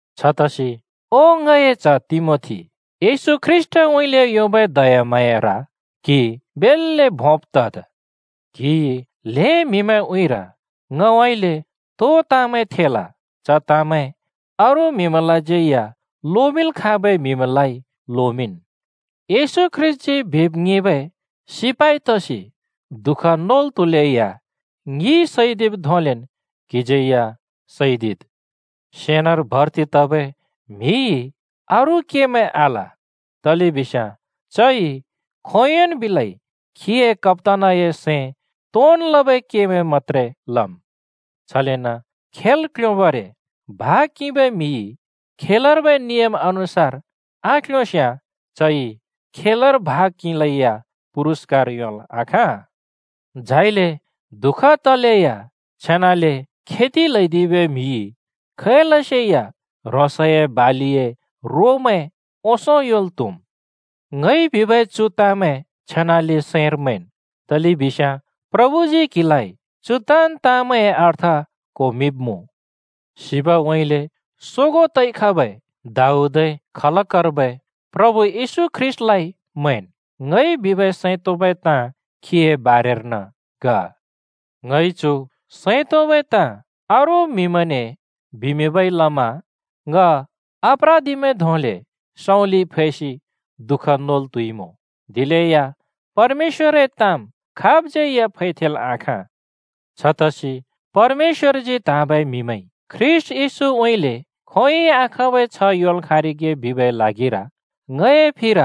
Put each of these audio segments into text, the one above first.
छतसि ओ, ङए च्‍ह तिमोथी, येशू ख्रीष्‍टउँइँले योंबै दयाम्हाँयार क्हि बेल्‍ले भोंब तद्। क्हिइ ल्‍हें म्‍हिए उँइँर ङउँइँले तो ताँमैं थेल, च ताँमैं अरू म्हिमैंलाज्यै या लोमिंल् खाँबै म्हिमैंलाइ लोमिंन्। येशू ख्रीष्‍टजी बिब् ङिंबै सिपाइ तसि दुःख नोल् त्हुलेया ङिइ सैदिब् धोंलेन् क्हिज्यै या सैदिद्। सेनार भर्ति तबै म्हिइ अरू केमैं आल, तलेबिस्याँ चइ खोंयोंन् बिलै खीए कप्‍तानए सैं तोंन् लबै केमैं मत्‍त्रे लम्। छलेन खेल् क्ल्योंबरे भाग किंबै म्‍हिइ खेलर्बै नियम अनुसार आक्ल्योंस्याँ चइ खेलर भाग किंलै या पुरूस्‍कार योंल् आखाँ। झाइले दुःख तलेया छेनाले खेद् ल्हैदिबै म्हिइ खैलसेया ह्रोंसए बालिए रोमैं ओंसों योंल् त्हुम्। ङइ बिबै चु ताँमैं छेनाले सैंर मैंन्, तलेबिस्याँ प्रभुजी क्हिलाइ चु ताँन् ताँमैंए अर्थ क्‍होमिंब्मुँ। सिबउँइँले सोगों तइ खबै दाऊदए खलकर्बै प्रभु येशू ख्रीष्‍टलाइ मैंन्। ङइ बिबै सैं तोंबै ताँ खीए बारेर्न ग। ङइ चु सैं तोंबै ताँ अरू म्हिमैंने बिमिंबै लमा ङ अप्रादिमैं धोंले सँउँलिइ फैसि दुःख नोल् त्‍हुइमुँ। दिलेया परमेश्‍वरए ताँम् खाबज्यै या फैथेंल आखाँ। छतसि परमेश्‍वरजी त्हाँबै म्‍हिमैंइ ख्रीष्‍ट येशूउँइँले खोंयोंइ आखाँबै छ्ह योंल् खाँरिगे बिबै ल्हागिर ङए फिर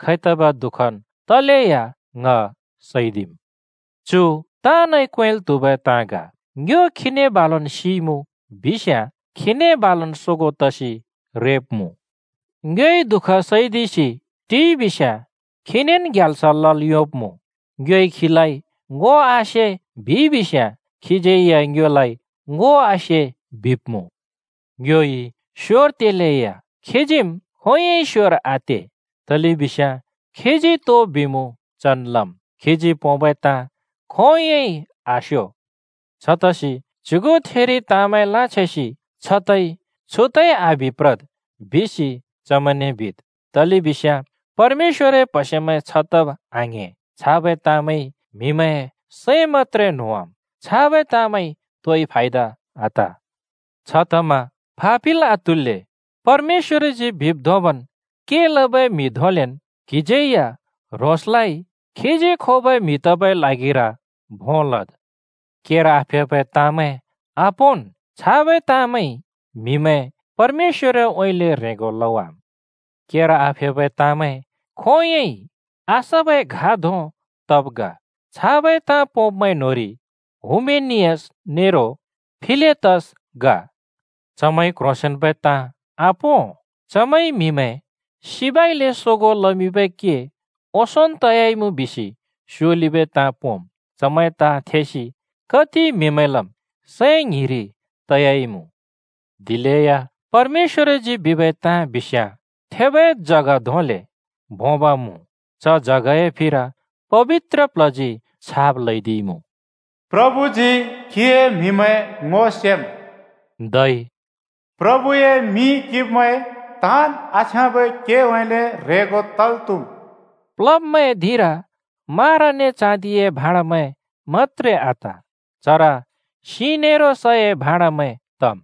खैतबै दुःखन् तलेया ङ सैदिम्। चु ताँनइ क्वेंल् त्हुबै ताँ ग: “ङ्यो खीने बालुन् सिइमुँ बिस्‍याँ खीने बालुन् सोगों तसि रेब्मुँ। ङ्योइ दुःख सैदिसि टिइबिस्‍याँ खीनेन् ग्याल्स लल् योंब्‍मुँ। ङ्योइ खीलाइ ‘ङो आसे’ बिइबिस्‍याँ खिज्‍यै या ङ्योलाइ ‘ङो आसे’ बिब्‍मुँ। ङ्योइमि स्योर तेलैया, खीजीम् खोंयोंइ स्‍योर आते, तलेबिस्याँ खीजी तो बिमुँ चन् लम्, खीजी पोंबै ताँ खोंयोंइ आस्यो।” छतसि च्युथिरि ताँमैं लाँछेंसि छ तइ छु तइ आबि प्रद् बिसि चमैंने बिद्, तलेबिस्याँ परमेश्‍वरए प्हसेमैं छ तब आङ्‍हें, छाबै ताँमैंइ म्हिए सैं मत्‍त्रे न्होंवाम्। छाबै ताँमैंइ तोइ फायदा आत। छतमा फापिल् आत्हुल्‍ले परमेश्‍वरजी बिब् धोंबन् के लबै म्हि धोंलेन् क्हिज्यै या ह्रोंसलाइ खीजी खोबै म्‍हि तबै ल्हागिर भों लद्। केर आफेबै ताँमैं आपोंन्, छाबै ताँमैंइ म्‍हिमैं परमेश्‍वरउँइँले ह्रेंगो लवाम्। केर आफेबै ताँमैं खोंयोंइ आसबै घा धों तब् ग। छाबै ताँ पोंब्मैं न्होंरि हुमेनियस नेरो फिलेतस ग। चमैंइ क्ह्रोंसेंन्बै ताँ आपों, चमैंइ म्हिमैं सिबइले सोगों लमिंबै के ओंसोंन् तयाइमुँ बिसि स्योलिबै ताँ पोंम्। चमैंए ताँ थेसि कति म्हिमैंलम् सैं ङ्हिरि तयाइमुँ। दिलेया परमेश्‍वरजी बिबै ताँ बिस्याँ थेबै जग धोंले भोंब मुँ। च जगए फिर पबित्र प्ल्हजी छाप ल्हैदिइमुँ, “प्रभुजी खीए म्हिमैं ङो सेमुँ” धै “प्रभए मिं किंब्मैं ताँन् आछ्याँबै केउँइँले ह्रेंगो तल् त्हुम्।” प्लब्मैंए धिंर मारा नेरो चाँदिए भाँडमैं मत्‍त्रे आत, चर सिं नेरो सए भाडोमैं तम्।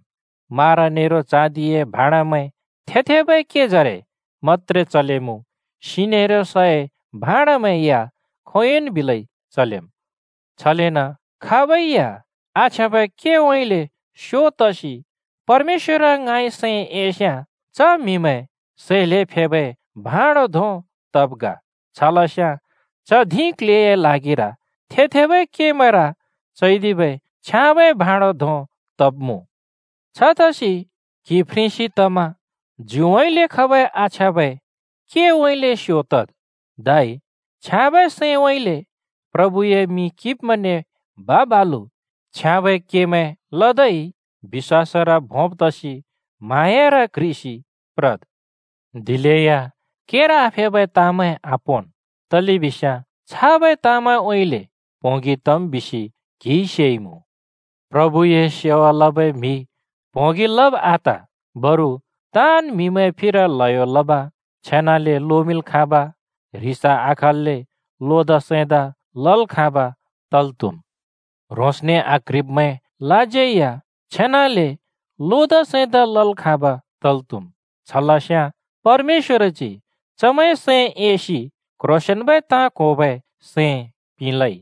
मारा नेरो चाँदिए भाँडमैं थे-थेबै केजरे मत्‍त्रे चलेमुँ, सिं नेरो सए भाँडमैं या खोंयोंन् बिलै चलेम्। छलेन खाबै या आछ्याँबै केउँइँले स्‍यो तसि परमेश्‍वर ङाँइ सैं एस्याँ च म्‍हि सै ल्हें फेबै भाँडो धों तब् ग। छलस्याँ च धिं क्ल्हेए ल्हागिर थे-थेबै केमैंर चैदिबै छ्याँबै भाँड धों तब्मुँ। छतसि क्हि फ्रेंसि तमा ज्युइँले खबै आछ्याँबै केउँइँले स्यो तद्, धै छ्याँबै सैंउँइँले प्रभुए मिं किंब्मैंने बा-बालु छ्याँबै केमैं लदै, बिश्‍वासर भोंब् तसि म्हाँयार क्ह्रिसि प्रद्। दिलेया केर आफेबै तामैं आपोंन्, तलेबिस्याँ छाबै ताँमैंउँइँले प्होंगि तम् बिसि क्हिइ सेइमुँ। प्रभुए सेवा लबै म्‍हि प्‍होंगि लब आत, बरु ताँन् म्हिमैंए फिर ल्हयो लब, छेनाले लोमिंल् खाँब, ह्रिस आखल्‍ले लोदा सैंदा लल् खाँब तल् त्हुम्। ह्रोंसने आक्‍ह्रिब्‍मैंलाज्यै या छेनाले लोदा सैंदा लल् खाँब तल् त्‍हुम्। छ लस्याँ परमेश्‍वरजी चमैंए सैं एसि क्ह्रोंसेंन्बै ताँ क्होबै सैं पिंलै।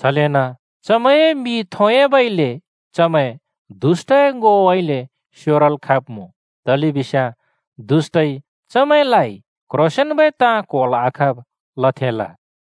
छलेन चमैंए मि थोंयाबइले चमैं दुष्‍टए ङोउँइँले स्योरल् खब्मुँ, तलेबिस्याँ दुष्‍टइ चमैंलाइ क्ह्रोंसेंन्बै ताँ क्होल् आखाँब लथेंल।